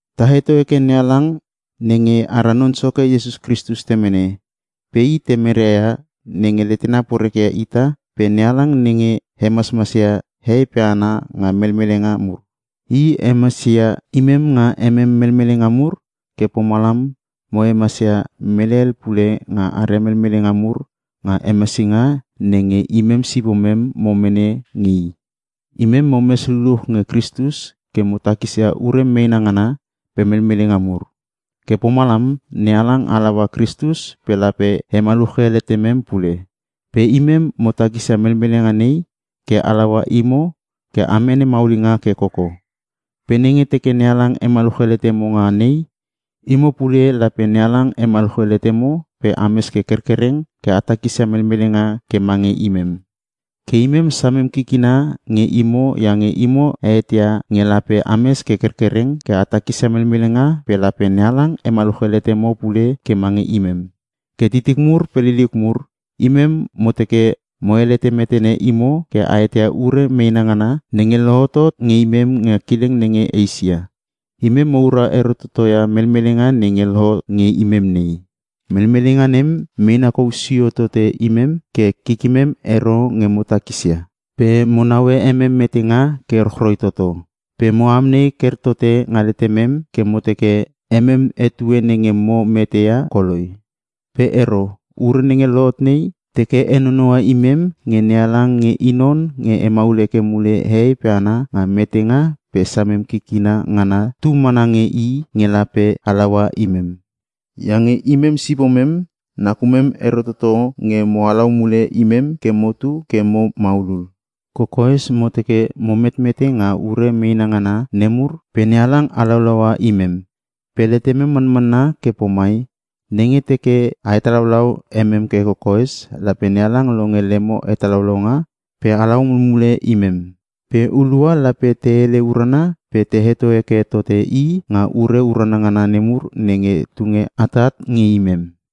Ta heto heke NeHalang nenge ara Non Soke Iesus Kristus Temene. Pe i Temere ia nenge letena poreke ia ita pe i NeHalang nenge hemasmas ia hehei pe hana nga melmelenga mur. I hemasia imem nga emem melmelenga mur ke pomalam mo hemasia mele hel pule nga aria melmelenga mur nga hemasinga nenge imem sipomem mo mene nge i. Imem momes luluch nge Kristus ke mo takisia ure meena ngana pe melmelenga mur. Ke pomalam NeHalang halaua Kristus pe lape hemaluche letemem pule. Pe imem mo takisia melmelenga nei ke halaua imo ke a mene maulinga ke koko. Pe nenge teke NeHalang hemaluche letemem nga nei, imo pule lape NeHalang hemaluche letemo pe ames ke kerkereng ke a takisia melmelenga ke mange imem. Ke imem samem kikina nge imo iange mo eteia nge lape ames ke kerkereng ke a takisia melmelenga pe lape NeHalang hemaluche letemo pule ke mange imem. Ke titik mur pe liliuk mur, imem mo teke mo helete metene imo ke a eteia ure meena ngana nenge lohotot nge imem nga kileng nenge Eisia. Imem moura ero totoia melmelenga nenge lohot nge imem nei. Melmelenga nem meena kou sio tote imem ke kikimem ero nge mo takisia, pe mo naue emem metenga ke rochroi toto. Pe mo amnei ker tote nga letemem ke mo teke emem etue nenge mo mete ia koloi. Pe ero, ure nenge lohot nei, teke henonoua imem nge NeHalang nge i non nge hemaul heke mule hehei pe hana nga metenga pe samem kikina ngana tu mana nge i nge lape halaua imem. Iange imem sipomem nakumem ero toto nge mo halau mule imem ke motu ke mo maulul. Kokoes mo teke mo metmete nga ure meena ngana nemur pe NeHalang halaulaua imem. Pe letemem manmanna ke pomai; Nenge teke a hetalaulau emem ke kokoes, lape NeHalang longe lemo hetalaulaunga pe halau mulmule imem. Pe hulua lape te hele urana pe te heto heke tote i nga ure urana ngana nemur nenge tunge atat nge imem.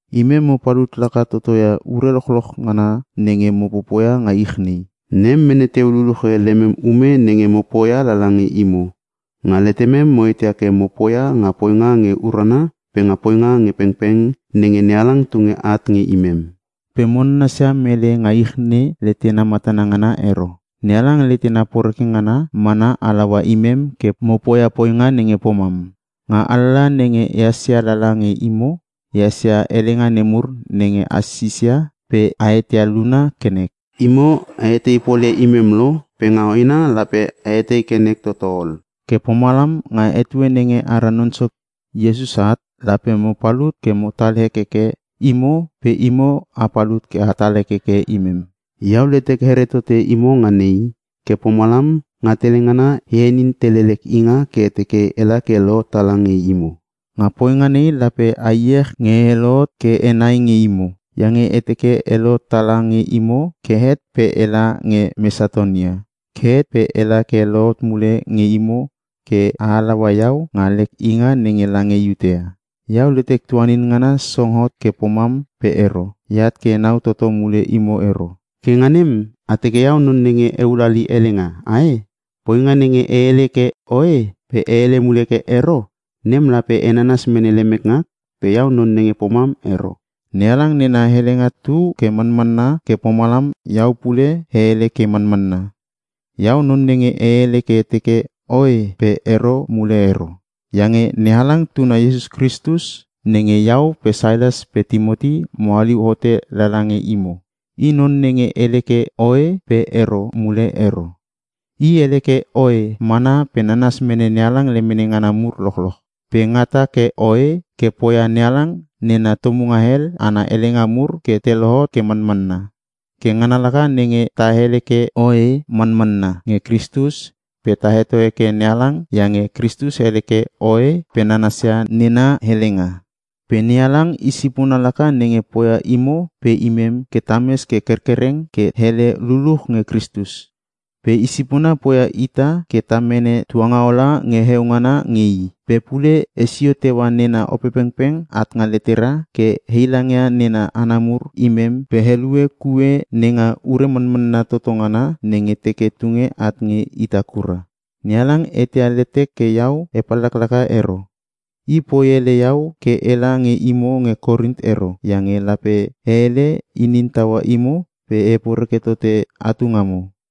Imem mo palut laka totoia ure lochloch ngana nenge mo popoia nga ich nei. Nem mene teu luluche lemem ume nenge mo poia lala nge imo. Nga letemem mo eteia ke mo poia nga poinga nge urana pe nga poinga nge pengpeng nenge NeHalang tunge at nge imem. Pe mo nanasia mele nga ich letena matana ngana ero, NeHalang letena poreke ngana mana halaua imem ke mo poia poinga nenge pomam. Nga alalaha nenge ehas ia lala nge imo ehas ia helenga nemur nenge a sisia pe a eteia luna ke nek. Imo a etei polia imem lo pe nga hoena lape a etei ke nek toto ol. Ke pomalam nga etue nenge ara Non Soke Iesus at, lape mo palut ke motal hekeke imo pe imo a palut ke atal hekeke imem. Iau letek here tote imo nga nei, ke pomalam nga tele ngana, e henin tele lek inga ke e teke ela ke e lohot tala nge imo. Nga poinga nei lape a iech nge e lohot ke henai nge imo. Iange e teke e lohot tala nge imo ke het pe ela nge Mesatonia, ke het pe ela ke e lohot mule nge imo ke a halaua iau nga lek inga nenge lange Iutea. Iau letek tuanin ngana song hot ke pomam pe ero, eat ke enau toto mule imo ero. Ke nga nem a teke iau non nenge ehul hali helenga ae? Poinga nenge e hele ke “Oe” pe e hele mule ke “Ero,” nem lape e nanas mene lemek ngak pe iau non nenge pomam ero. NeHalang nena helenga tu ke manmanna ke pomalam iau pule e hele ke manmanna. Iau non nenge e hele ke teke, “Oe” pe “Ero” mule ero. Iange NeHalang Tuna Iesus Kristus nenge Iau pe Sailas pe Timoti mo haliu hote lala nge imo, I non nenge hele ke “Oe” pe “Ero” mule ero. I hele ke “Oe” mana pe nanas mene NeHalang lemene ngana mur lochloch. Pe ngata ke “Oe” ke poia NeHalang nena tomunga hel ana helenga mur ke te lohot ke manmanna. Ke ngana laka nenge ta hele ke “Oe Manmanna” nge Kristus pe ta heto heke NeHalang iange Kristus hele ke “Oe” pe nanasia nena helenga. Pe NeHalang i sipona laka nenge poia imo pe imem ke tames ke kerkereng ke hele luluch nge Kristus. Pe i sipona poia ita ke ta mene tuangaola nge heongana nge i. Pe pule hesio teua nena Opepengpeng at nga letera ke heilangia nena hana mur imem pe helue kue nenga ure manmanna toto ngana nenge teke tunge at nge ita kura. NeHalang eteia letek ke iau e pallaklaka ero. I poi ele iau ke ela nge imo nge Korin ero, iange lape e hele inin taua imo pe e heporeke tote atu ngamo.